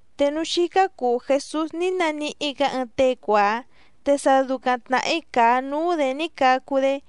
Te núú xícá cùu Jesús ní naníhí‑gǎ ɨɨⁿ tée cuàá, te sa ducaⁿ tnàhí càa núú‑dě ní cacu‑dé.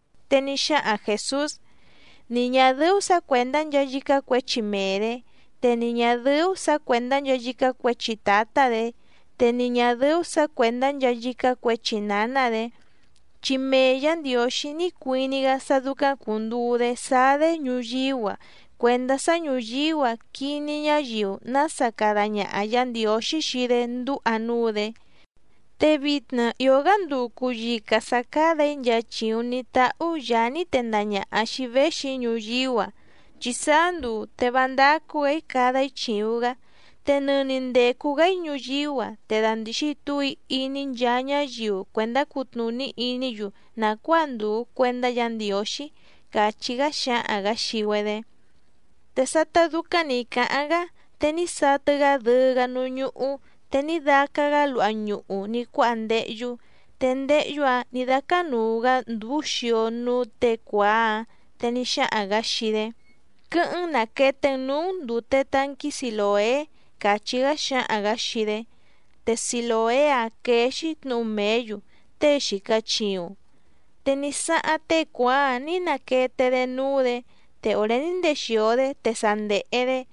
Te ní xáhaⁿ Jèsús: —Ni ñà dɨ́ú sǎ cuèndá nchaa yícá cuěchi mee‑dě, te ni ñà dɨ́ú sǎ cuèndá nchaa yícá cuěchi tǎtá‑dě, te ni ñà dɨ́ú sǎ cuèndá nchaa yícá cuěchi nǎná‑dě, chi mee Yǎ Ndiǒxí ní cuiní‑gá sá dúcáⁿ cùnduu‑dé sáá‑dé ñuyíú‑a cuèndá sá ñùyíú‑a quiní ñáyiu nása cada ñaha Yǎ Ndiǒxí xii‑dé ndúha núú‑dě. Te vitna ìó‑gá nduu cùyica sá cádà‑í nchaa chìuⁿ ní táhú Yàá ní tendaha ñàha xii‑í véxi‑í ñuyíú‑a, chi sáá nduu te vá ndácú‑gǎ‑í cada‑í chìuⁿ‑gá. Te nɨni ndècu‑gá‑í ñuyíú‑a te dàndixi túu‑í iní nchaa ñáyiu cuèndá cutnùní iní‑yu nàcuáa ndùu cuendá Yǎ Ndiǒxí —càchí‑gá xáhaⁿ‑gǎ xii‑güedé. Te sátá dúcáⁿ nǐ cáháⁿ‑gá, te ní satɨ‑gá dɨɨ́‑gá núú ñúhú te ní dácá‑gǎ luha ñuhu ní cuáha ndéhyú, te ndéhyú‑ǎⁿ nǐ dácánùu‑gá ndúú xio núú těe cuàá‑áⁿ. Te ní xáhaⁿ‑gǎ xii‑dé: —Quɨ́hɨ́ⁿ‑n nàquete‑n núú‑n ndùte tanquí Silòé —càchí‑gá xáhaⁿ‑gǎ xii‑dé. Te Silòé‑áⁿ quéé‑xí tnǔhu mèé‑yu: Tée xìca chiuⁿ. Te ní sáháⁿ tée cuàá‑áⁿ nǐ naquete‑dé núú‑dě, te òré ní ndexìo‑dé te sa ndèhe‑dé.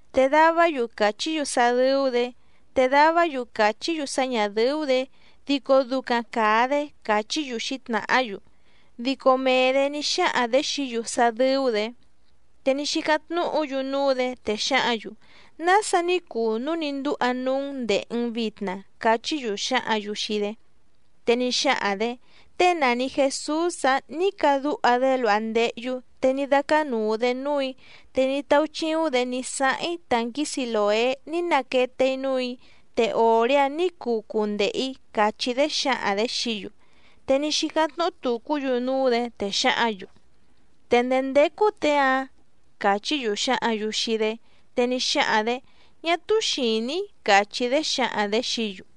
Te davá‑yu càchí‑yu sá dɨ́ú‑dě, te davá‑yu càchí‑yu sá ñà dɨ́ú‑dě, dico ducaⁿ càa‑dé, càchí‑yu xǐtnàhá‑yu. Dico mee‑dě ní xáhaⁿ‑dě xií‑yu sá dɨ́ú‑dě. Te ní xícáⁿ tnúhǔ‑yu núú‑dě, te xǎhǎⁿ‑yu: —¿Nása ní cuu núu ní ndúha núú‑n ndèhe‑n vitna? —cachí‑yu xǎhǎⁿ‑yu xii‑dé. Te ní xáhaⁿ‑dě: —Tée nàni Jesús‑ǎⁿ ní cadúha‑dé luha ndéhyú te ní dácánùu‑dé núù‑í, te ní táúchíúⁿ‑dě ní sáháⁿ‑í tànquí Silòé ní naquete‑í núù‑í, te òré‑áⁿ nǐ cuu cundehe‑ǐ —càchí‑dé xǎhaⁿ‑dě xií‑yu. Te ní xícáⁿ tnúhú tùcú‑yu núú‑dě, te xǎhǎⁿ‑yu: —¿Te ndèé ndécú těe‑áⁿ? —càchí‑yu xǎhǎⁿ‑yu xii‑dé. Te ní xáhaⁿ‑dě: —Ñá túú xìní‑í —càchí‑dé xǎhaⁿ‑dě xií‑yu.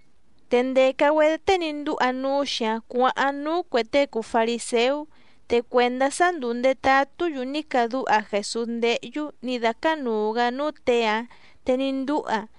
Te ndèca‑güedé tée ní ndúha núú‑xi‑áⁿ cuǎháⁿ núú cuè tée cùu fariséú. Te cuèndá sá ndùu ndetatú‑yu ní cadúha Jèsús ndéhyú nǐ dácánùu‑gá núú těe‑áⁿ te ní ndúha,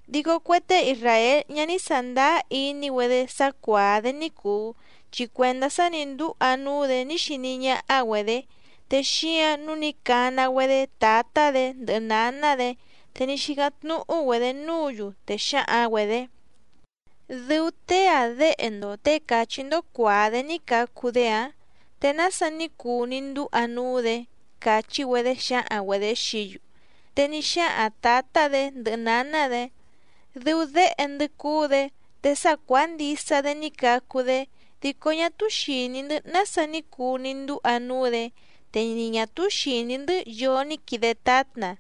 Dico cue tée isràél ñá ní sàndáá iní‑güedé sá cuàá‑dé ní cùu, chi cuèndá sa ní ndúha núú‑dě ní xiní ñáhá‑güedě, te xíǎⁿ nǔu ní cana‑güedé tǎtá‑dě ndɨhɨ nǎná‑dě, te ní xícáⁿ tnúhú‑güedě núǔ‑yu, te xǎhaⁿ‑güedě: —¿Dɨu tée‑a déhe‑ndo těe càchí‑ndó cuàá‑dé ní cacu‑dé‑ǎⁿ? ¿Te nása ní cuu ní ndúha núú‑dě? —càchí‑güedé xǎhaⁿ‑güedě xií‑yu. Te ní xáhaⁿ tǎtá‑dě ndɨhɨ nǎná‑dě: —Dɨu déhe‑ndɨ́ cúú‑dě te sa cuàá ndisa‑dé ní cacu‑dé, dico ñá túú xìní‑ndɨ́ nása ní cuu ní ndúha núú‑dě, te ni ñà túú xìní‑ndɨ́ yoo ní quide tátna.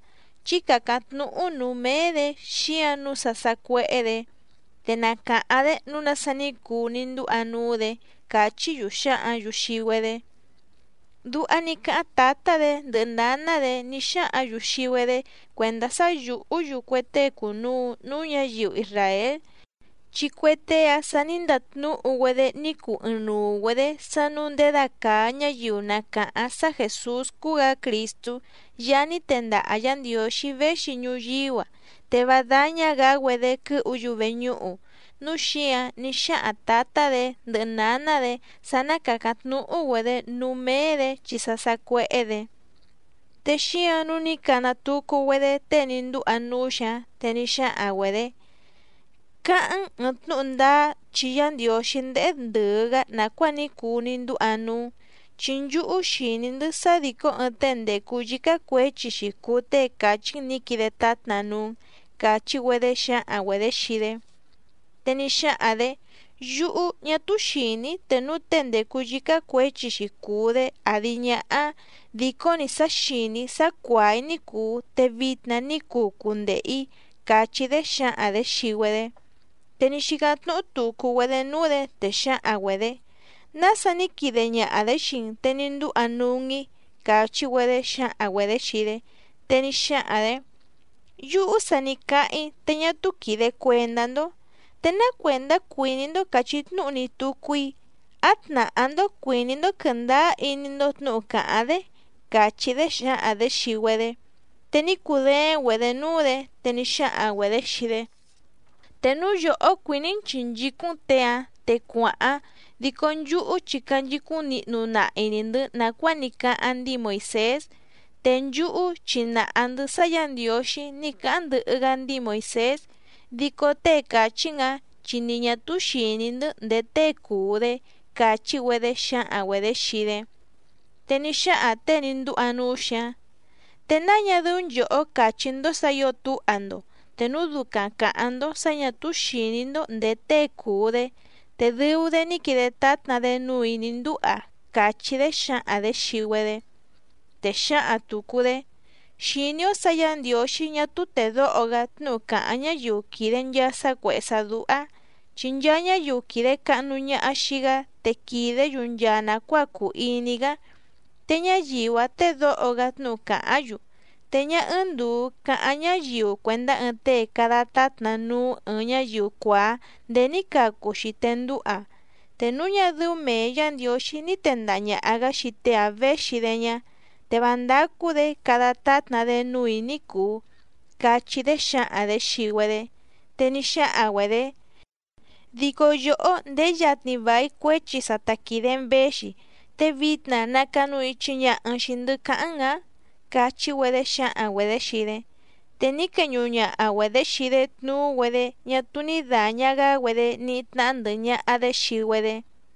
Chí càcáⁿ tnúhú nǔú méé‑dě xíǎⁿ nǔu sa sàcuéhé‑dě, te na càháⁿ‑dé nǔu nása ní cuu ní ndúha núú‑dě —càchí‑yu xǎhǎⁿ‑yu xii‑güedé. Duha ní cáháⁿ tǎtá‑dě ndɨhɨ nǎná‑dě ní xáhǎⁿ‑yu xii‑güedé cuèndá sá yùhú‑yu cue tée cùnuu núú ñǎyiu isràél, chi cue tée‑ǎⁿ sa ní ndatnúhu‑güedé ní cuu ɨɨⁿnuu‑güedě sá nǔu ndědacàa ñáyiu na càháⁿ sá Jèsús cúú‑gǎ Crìstú Yaá ní tendaha Yǎ Ndiǒxí véxi ñuyíú‑a, te vá dáñá‑gǎ‑güedé quɨ́hu‑yu veñúhu. Núu xíǎⁿ ní xáhaⁿ tǎtá‑dě ndɨhɨ nǎná‑dě sá ná càcáⁿ tnúhú‑güedě núú méé‑dě chi sa sacuéhé‑dě. Te xíǎⁿ nǔu ní cana tucu‑güedé tée ní ndúha núú‑xi‑áⁿ, te ní xáhaⁿ‑güedě: —Cáháⁿ‑n ɨ̀ɨⁿ tnúhu ndáá chi Yá Ndiǒxí ndéhé ndɨ̀ɨ‑gá nàcuáa ní cuu ní ndúha núú‑n, chi nchúhú xìní‑ndɨ́ sá dìcó ɨɨⁿ tée ndècu yícá cuěchi‑xi cùu tée càchí‑n nǐ quide tátna núú‑n —càchí‑güedé xǎhaⁿ‑güedě xii‑dé. Te ní xáhaⁿ‑dě: —Yúhú, ñá túú xìní‑í te núu tée ndècu yícá cuěchi‑xi cùu‑dé àdi ñáhá. Dìcó‑ni sá xìní‑í sá cuàá‑í ní cùu te vitna ní cuu cundehe‑ǐ —càchí‑dé xǎhaⁿ‑dě xii‑güedé. Te ní xícáⁿ tnúhú tùcu‑güedé núú‑dě, te xǎhaⁿ‑güedě: —¿Nása ní quide ñaha‑dě xii‑n te ní ndúha núú‑n‑í? —càchí‑güedé xǎhaⁿ‑güedě xii‑dé. Te ní xáhaⁿ‑dě: —Yúhú sa ní cáháⁿ‑í te ñá túú quìde cuendá‑ndó. ¿Te ná cuèndá cuìní‑ndó càchí tnúhu‑ni tucu‑í? ¿Á tnàhá‑ndó cuìní‑ndó quɨ̀ndáá iní‑ndó tnǔhu càháⁿ‑dé? —càchí‑dé xǎhaⁿ‑dě xii‑güedé. Te ní cudééⁿ‑güedě núú‑dě, te ní xáhaⁿ‑güedě xii‑dé: —Te núu yòhó cuìní‑n chìnchícúⁿ‑n těe‑ǎⁿ te cuàháⁿ, dico nchúhú chi canchicúⁿ nihnu nahi‑ni‑ndɨ̌ nàcuáa ní cáháⁿ ndíi Moìsés. Te nchúhú chi nàha‑ndɨ́ sá Yǎ Ndiǒxí ní cáháⁿ ndɨhɨ‑gá ndíi Moìsés, dico tée càchí‑n‑ǎⁿ chi ni ñà túú xìní‑ndɨ́ ndèé tée cùu‑dé —càchí‑güedé xǎhaⁿ‑güedě xii‑dé. Te ní xáhaⁿ těe ní ndúha núú‑xi‑áⁿ: —¿Te náa ñá dɨ́ú nchòhó càchí‑ndó sǎ ǐo túha‑ndo? Te núu ducaⁿ càháⁿ‑ndó sǎ ñà túú xìní‑ndó ndèé tée cùu‑dé, te dɨu‑dé ní quide tátna‑dé núù‑í ní ndúha —càchí‑dé xǎhaⁿ‑dě xii‑güedé. Te xǎhaⁿ tùcu‑dé: —Xìní‑ó sǎ Yǎ Ndiǒxí ñá túú tèdóho‑gá tnúhu càháⁿ ñáyiu quìde nchaa sá cuèhé sá dúhá, chi nchaa ñáyiu quìde cahnu ñaha xii‑gá te quìdé‑yu nchaa nàcuáa cùu iní‑gá, te ñáyiu‑áⁿ tédǒho‑gá tnúhu càháⁿ‑yu. Te ñá ɨ́ɨ́ⁿ ndùu cáháⁿ ñáyiu cuèndá ɨɨⁿ tée cada tátna núú ɨ̀ɨⁿ ñáyiu cuàá ndéé ní cacu‑xi te ndúha. Te núu ñá dɨ́ú mèe Yá Ndiǒxí ní tèndaha ñaha‑gá xii tée‑ǎⁿ véxi‑dé ñá, te vá ndácú‑dě cada tátna‑dé núù‑í ní cùu —cachí‑dé xǎhaⁿ‑dě xii‑güedé. Te ní xáhaⁿ‑güedě: —Dico yòhó ndèé yatni vài cuéchi sa ta quìde‑n véxi, ¿te vitna nacanu ichi ñaha‑n xìi‑ndɨ́ cáháⁿ‑n‑ǎⁿ? —càchí‑güedé xǎhaⁿ‑güedě xii‑dé. Te ní queñuhu ñaha‑güedě xii‑dé tnuú‑güedé ñá túú ní dàña‑gá‑güedé níhí tnáhá ndɨ̀hɨ ñaha‑dé xii‑güedé.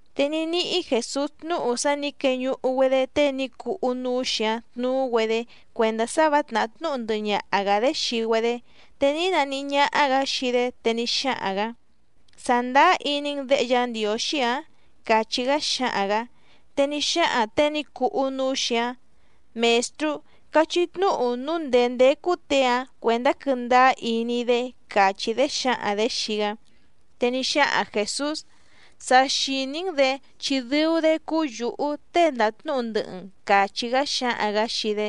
Te ní níhí Jèsús tnúhu sá nǐ queñuhu‑güedé tée ní cuhú núú‑xi‑áⁿ tnuú‑güedé cuèndá sá vǎ tnàhá tnúhu ndɨhɨ ñaha‑gǎ‑dé xii‑güedé, te ní naníhí ñáhá‑gǎ xii‑dé te ní xáhaⁿ‑gǎ: —¿Sàndáá iní‑n Děhe Yá Ndiǒxí‑ǎⁿ? —càchí‑gá xáhaⁿ‑gǎ. Te ní xáhaⁿ těe ní cuhú núú‑xi‑áⁿ: —Mèstrú, cachí tnúhu núu ndèé ndécú těe‑áⁿ cuèndá quɨ́ndáá iní‑í‑dé —càchí‑dé xǎhaⁿ‑dě xii‑gá. Te ní xáhaⁿ Jèsús: —Sa xìní‑n‑dě chi dɨu‑dé cúú yǔhú tée ndàtnúhu ndɨhɨ‑n —càchí‑gá xáhaⁿ‑gǎ xii‑dé.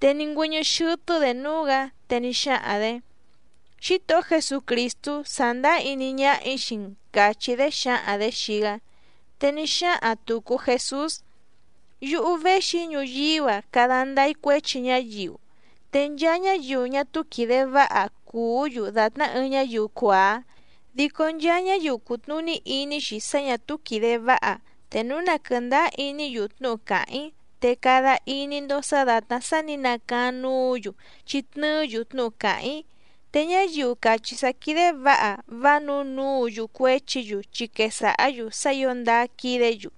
Te ní ngüɨ́ñɨ́ xɨ́tɨ́‑dě núú‑gǎ, te ní xáhaⁿ‑dě: —Xítohó Jesucrìstú, sàndáá iní ñáhà‑í xii‑n —càchí‑dé xǎhaⁿ‑dě xii‑gá. Te ní xáhaⁿ tùcu Jesús: —Yúhú véxi‑í ñuyíú‑a cada ndáá‑í cuéchi ñáyiu. Te nchaa ñáyiu ñá túú quìde váha cùú‑yu dàtná ɨɨⁿ ñáyiu cuàá, dico nchaa ñáyiu cùtnuní iní‑xi sá ñà túú quìde váha, te núu na quɨ̀ndáá iní‑yu tnúhu càháⁿ‑í, te cada iní‑ndó sǎ dàtná sá nǐ nacaáⁿ núǔ‑yu chi tnɨɨ́‑yu tnúhu càháⁿ‑í. Te ñáyiu càchí sá quídé vǎha vá nǔu núu‑yu cuéchi‑yu chi quesàhá‑yu sá ǐo ndáá quídě‑yu,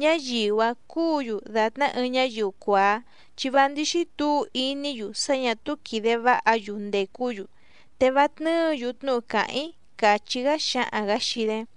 ñáyiu‑áⁿ cúǔ‑yu dàtná ɨɨⁿ ñáyiu cuàá, chi vá ndíxí tǔu iní‑yu sá ñà túú quìde váha‑yu ndècú‑yu, te vá tnɨ́ɨ̌‑yu tnúhu càháⁿ‑í —càchí‑gá xáhaⁿ‑gǎ xii‑dé.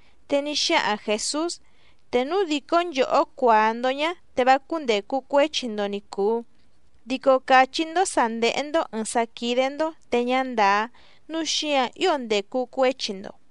Te ní xáhaⁿ Jèsús: —Te núu dìcó nchòhó cuàá‑ndó ñá, te vá cúndècu cuéchi‑ndo ni cùu, dico càchí‑ndó sǎ ndéhé‑ndó ɨ̀ɨⁿ sá quídé‑ndó te ñá ndàá, núu xíǎⁿ ío ndècu cuéchi‑ndo.